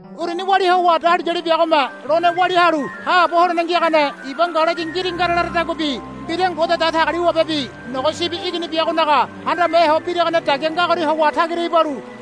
Uruni walia howa dahuliyali biagome lone walia halu haabo holene ngiagane iba ngalayi ngiringara laradaguabi mbira Ngode Datagaliwabebi Nogo Sibi Igini biagobinaga handame ho biragane dagia ngagoria howa tagira ibalu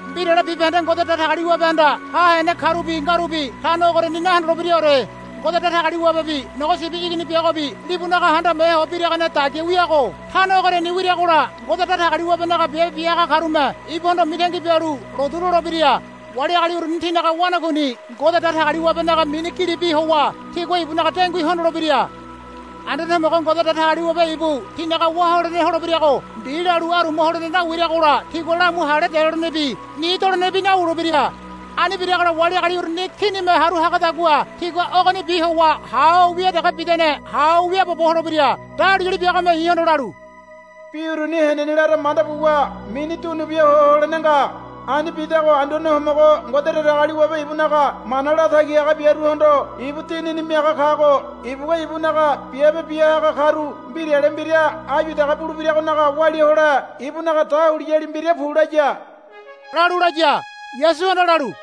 Mbirale bibahende Ngode Datagaliwabehanda ha hene karubi ngarubi tano ogoriani nahondolebiraore. Ngode Datagaliwabebi Nogo Sibi Igini biagobi libunaga handame ho biragane dagia wiago tano ogoriani wiragola Ngode Datagaliwabenaga biabe bia haga karume ibuhondo mitangi bialu lotu lolebira. Wali agali uruni tinaga wanakuini Ngode Datagaliwabenaga mini gilibi howa tigua ibunaga dengui hondolebira. Anduane Homogo Ngode Datagaliwabe ibu tinaga wá holene holebirago mbi lalu aruma holene nawiragola tigua lamu hale delolenebi ni dolenebi nawulebira. Ani biragola wali agali uruni kinime haru hagadagua tigua ogonibi howa ha ho wia dege bidane ha ho wiaabobo holebira. Dahuliyali biagome i̱hondo lalu, Bi uruni henene lara manda buwa mini dunubia ho holene nga. Ani bidago Anduane Homogo Ngode Datagaliwabe ibunaga mana latagi haga biaruhondo ibu Dinini miaga kago ibugua ibunaga biabe bia haga karu mbirale mbira áyu dege bulebiragonaga walia hole ibunaga dahuliyali mbira, Pu, laya, lalu laya. Yasuhanda lalu,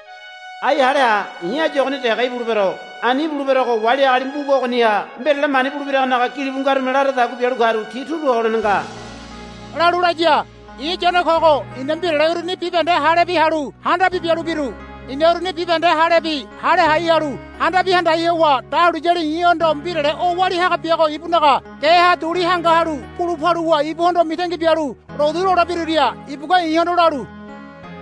Ai hale ha. I̱ áyu ogoni dege ibulebero. Ani ibuleberogo wali agali mbuga ogoniha mbirale mani bulebiragonaga gilibu ngarume laradagua bialu karu ti turu ho holene nga, lalu laya. I̱ Yone kogo i̱na mbirale uruni bibahende halebi halu handabi bialu biru. I̱na uruni bibahende halebi hale hai halu handabi handai howa dahuliyali i̱hondo mbirale o walia haga biago ibunaga geha duli hanga halu bulu paluwa ibuhondo mitangi bialu lotu lolebiruria ibugua i̱hondo lalu,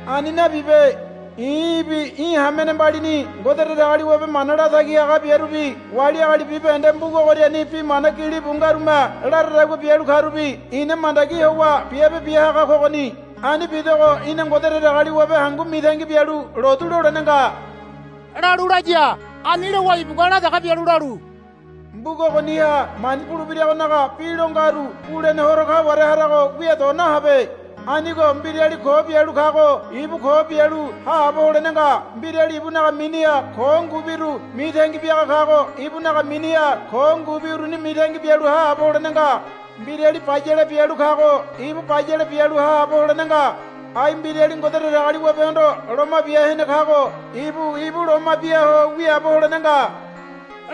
Ani nabibe. I̱ í̠bi í̠ hamene mbalini Ngode Datagaliwabe mana latagi haga biarubi wali agali bibahende mbuga ogoriani bi mana gilibu ngarume laradagua bialu karubi ina mandagi howa biabe bia haga kogoni. Ani bidogo í̠na Ngode Datagaliwabe hangu mitangi bialu lotu lolene nga, lalu laya. Ani lowa ibugua la dege bialu lalu, Mbuga ogoniha mani bulebiragonaga bi lo ngaru bulene horo kaware harago wia do nahabe. Anigo mbirali ko bialu kago ibu ko bialu haabo holene nga. Mbirali ibunaga miniha ko ngubiru mitangi biaga kago ibunaga miniha ko ngubi uruni mitangi bialu haabo holene nga. Mbirali bayale bialu kago ibu bayale bialu haabo holene nga. Ai mbirali Ngode Datagaliwabehondo loma bia hene kago ibu ibu loma bia ho wiaabo holene nga,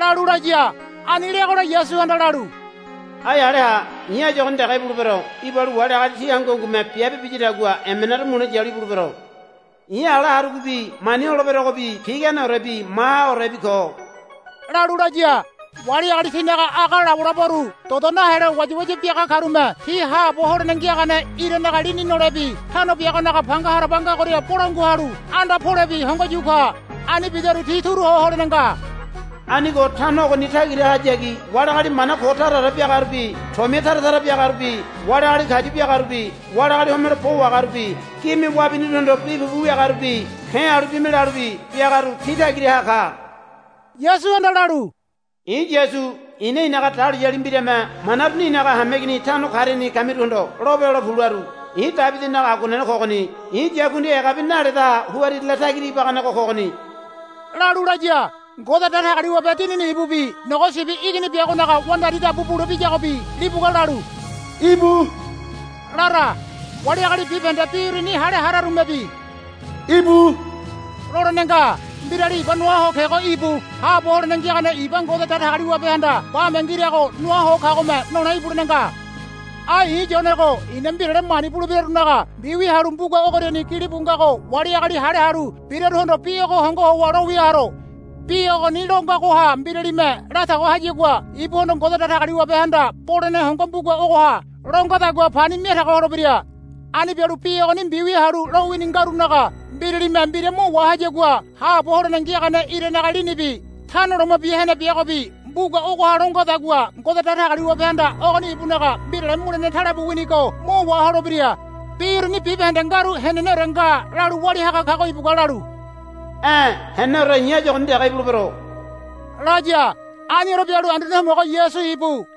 lalu laya. Ani leagola Yasuhanda lalu, Ai hale ha. I̱ áyu ogoni dege ibulebero. Ibalu wali agali ti hangu hangume biabe biyadagua emenaru mule yalu ibulebero. I̱ ala harugobi mani holeberogobi piganeorebi mahaorebi ko, lalu laya. Wali agali tinaga aga labolaboru dodo nahelo wayawaya biaga karume ti haabo holene ngiagane iranaga lini nolebi tano biagonaga panga haraba ngagoria bolangua halu anda polebi hongo yu ka. Ani bidaru ti turu ho holene nga. Anigo tano ogoni tagirahayagi wali agali mana ko taraore biagarubi tomia tara tara biagarubi wali agali kayu biagarubi wali agali homelo bo wahagarubi gime wabiniruhondo bi pupu wiagarubi ke̱ halu bime lalubi biagaru ti tagiraha ka. Yasuhanda lalu, I̱ Yasu i̱na i̱naga dahuliyali mbirame mana uruni i̱naga hameigini tano kariani kamiruhondo lope hole pu, laru. I̱ Debidinaga aguanene kogoni. I̱ yakundi egabi naledaha huririle tagira ibaganego kogoni, lalu laya. Ngode Datagaliwabe Dinini ibubi Nogo Sibi Igini biagonaga wandari dabu bulebiyagobi libugua lalu, Íbu, lara. Wali agali bibahende bi uruni hale hararumebi, Íbu, lolene nga. Mbirali iba noa ho kego íbu. Haabo holene ngiagane iba Ngode Datagaliwabehanda bame ngirago noa ho kagome nole ibulene nga. Ai i̱ Yonego i̱na mbirale mani bulebirarunaga mbiwia halu mbuga ogoriani gilibu ngago wali agali hale halu biraruhondo bi ogo hongo howa lowia haro. Bi ogoni lo ngagoha mbiralime latago hayagua ibuhondo Ngode Datagaliwabehanda bolene hongo mbuga ogoha lo ngadagua pani miatago holebira. Ani bialu bi ogoni mbiwia halu lowini ngarunaga mbiralime mbira mo wahayagua haabo holene ngiagane iranaga linibi Tano Loma Bia Hene biagobi mbuga ogoha lo ngadagua Ngode Datagaliwabehanda ogoni ibunaga mbirale mulene talebu winigo mo waholebira. Bi uruni bibahende ngaru, Heneneore nga, lalu walia haga kago ibugua lalu, E̱ heneneore i̱ áyu ogoni dege ibulebero, laya. Aniore bialu Anduane Homogo Yasu íbu.